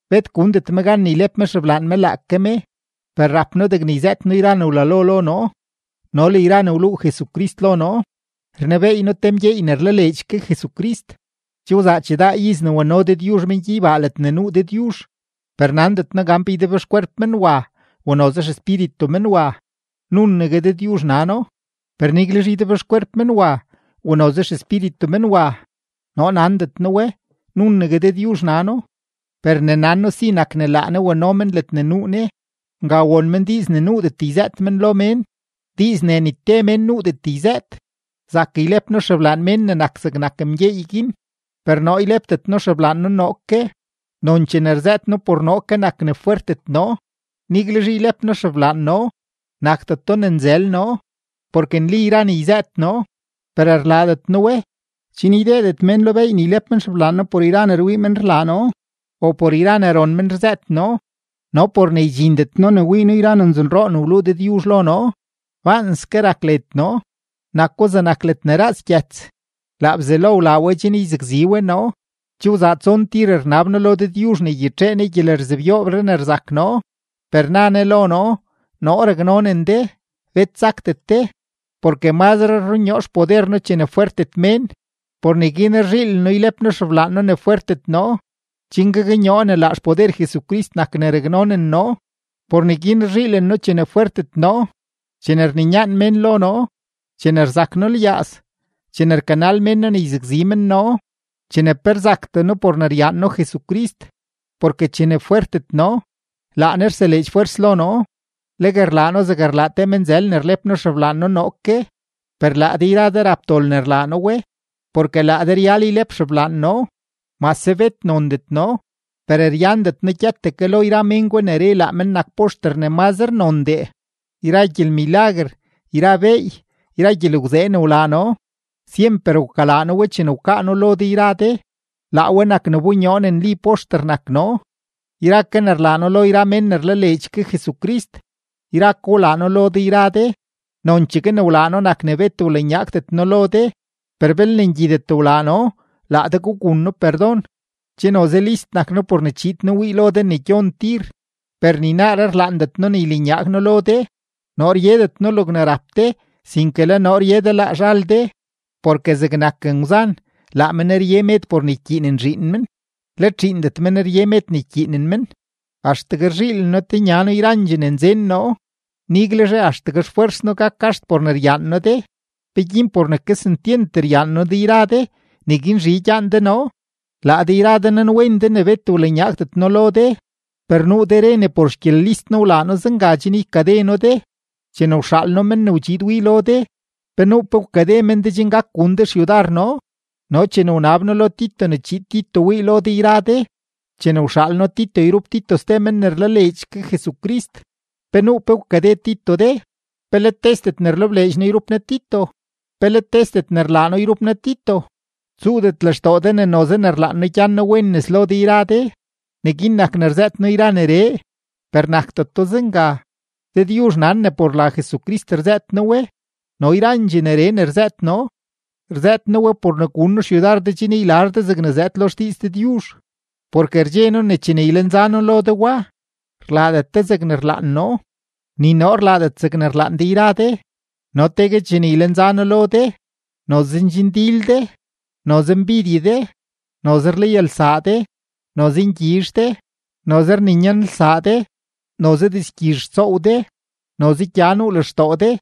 Bet gundet me gan ne ylep me xeblaan me laake me, per rap noo degne yzëët noo yra ne wlalo lo noo no le yra ne wluu Jesucrist lo noo. Rnebeey noo te mgyeey ne rlaleedx ke Jesucrist; che wzaa chidaa iz ne wano Dëdyuzh men gyeybaa ledne nuu Dëdyuzh, per nandet noo gan pe ydebxkwerp men wa o noze xespíritu men wa, nunegue Dëdyuzh nano. Per niguelzhe ydebxkwerp men wa o noze xespíritu men wa, noo nandet noo we, nunegue Dëdyuzh nano, per ne nan noo si nak ne laa Ne wano men ledne nuu Ne; nga won men diiz ne nuudet yzëët men lo mén, diiz ne ni te mén nuudet yzëët. Zak ylep noo xeblaan mén ne nak zegnak mgyeey guin, per noo ylepdet noo xeblaan noo noo ke; nonchee ne rzëët noo por noo ke nak ne fwertet noo. Niguelzhe ylep noo xeblaan noo, nakdeto ne nzël noo, porke nli yra ne yzëët noo; per rlaadet noo we, chen ydeedet mén lo beey ne ylep men xeblaan noo por yra ne rwii men rlaa noo o por yra ne ron men rzëët noo. No por ne ydxindet noo ne wii noo yra ne nzonroo ne wluu Dëdyuzh lo noo, baanske rak led noo, nako zegnak ledne raaz gyëts; laa Bzelo wlaa we chen yzakzi we noo. Che wzaa tson tir rnab noo lo Dëdyuzh ne ygyitxee Ne gyelerzebyoobree ne rzak noo. Per na Ne lo noo: “Noo raknonen de, bet sakdet de; porke mazre rrunyoo xpoder noo chene fwertet mén.” Por neguin rzhiilen noo ylep noo xeblaan noo ne fwertet noo, chen gaknyoo ne laa xpoder Jesucrist nak ne raknonen noo. Por neguin rzhiilen noo chene fwertet noo, chene rninyaan mén lo noo, chene rzak noo lyaaz, chene rkanal mén noo ne yzakzi men noo, chene pe rzaktee noo por ne ryaan noo Jesucrist, porke chene fwertet noo, laa Ne rseleedx fwers lo noo. Legue rlaa noo zeg rlaa te menzël ne rlep noo xeblaan noo noo ke, per laa de yra de rap dol ne rlaa noo we, porke laa de ryal ylep xeblaan noo. Mase bet nondet noo, per ryandet noo gyëtdee ke lo yra mén gwa ne re ne laa men nak poxter ne mazre nondee. Yra gyelmilaguer, yra beey, yra gyelgwzee ne wlaa noo, syemper wkalaa noo we chene wkaa noo lo de yra de; laa we nak ne wbonyoo ne nli poxter nak noo. Yra ke ne rlaa noo lo yra mén ne rlaleedx ke Jesucrist, yra ko wlaa noo lo de yra de, nonchegue ne wlaa noo nak ne bet wlanyaagdet noo lo de, per belne ngyidet wlaa noo, laa de gugun noo perdon. Che noze list nak noo por ne chiid noo wii lo de ne gyon tir, per ni naaree rlaandet noo ne ylanyaag noo lo de. Noo ryedet noo logne rap de, sinke le noo rye de laa zhal de, porke zegnak ngwzan, laa men rye med por ne ykyiinen zhiin men, let zhiindet men rye med ne ykyiinen men. Axtegue rzhiilen noo tenya noo yrandxee ne nzen noo, niguelzhe axtegue xfwers noo gak gaxt por ne ryaan noo de. ¿Peguin por ne kesentyent ryaan noo de yra de, neguin zhi gyaan de noo? Laa de yra de nanwen de ne bet wlanyaagdet noo lo de, per nuu de re ne por xgyelist noo wlaa noo zenga chen ykade noo de. Chene wxaal noo men ne wdxiid wii lo de, ¿pe nuu pe wkade men de chen gak gun de xyudar noo? No chene wnab noo lo Tito ne chiid Tito wii lo de yra de, chene wxaal noo Tito yrup Tito ste men ne rlaleedx ke Jesucrist, ¿pe nuu pe wkade Tito de? ¿Pe let tesdet ne rlebleedx noo yrup noo Tito? ¿Pe let tesdet ne rlaa noo yrup noo Tito? Tsuudet lextoo de ne noze ne rlaan noo ne gyan noo wen nes lo de yra de, neguin nak ne rzëët noo yra neree. Per nakdeto zenga; Dëdyuzh nan ne por la Jesucrist rzëët noo we, no yrandxee neree ne rzëët noo, rzëët noo we por ne gun noo xyudar de chen ylar de zegne zëëd lo xdiiz Dëdyuzh. Porke rdxe noo ne chene ylenza noo lo de wa, rlaadet de zegne rlaan noo, ni noo rlaadet zegne rlaan de yra de. No tegue chene ylenza noo lo de, noze ndxindil de, noze mbidye de, noze rlayalsaa de, noze ngyizh de, noze rninyanlsaa de, noze dizgyizh rtsoow de, noze gya nuu lextoo de,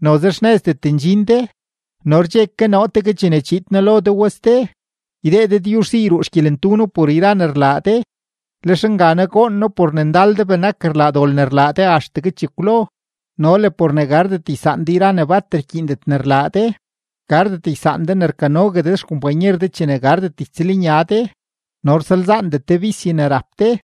noze xnëzdet ndxin de. No rdxe ke noo tegue chene chiid noo lo de wa ste, ydee Dëdyuzh si yruu xgyelentu noo por yra ne rlaa de, lex nganaa goon noo por ne ndal de benak rlaa dol ne rlaa de axtegue chekwlo no le por ne gardet ysaan de yra ne bat rkyiindet ne rlaa de, gardet ysaan de ne rkanogue de xkompanyer de chene gardet ytsëlnya de, no rsalzaandet de bisye ne rap de.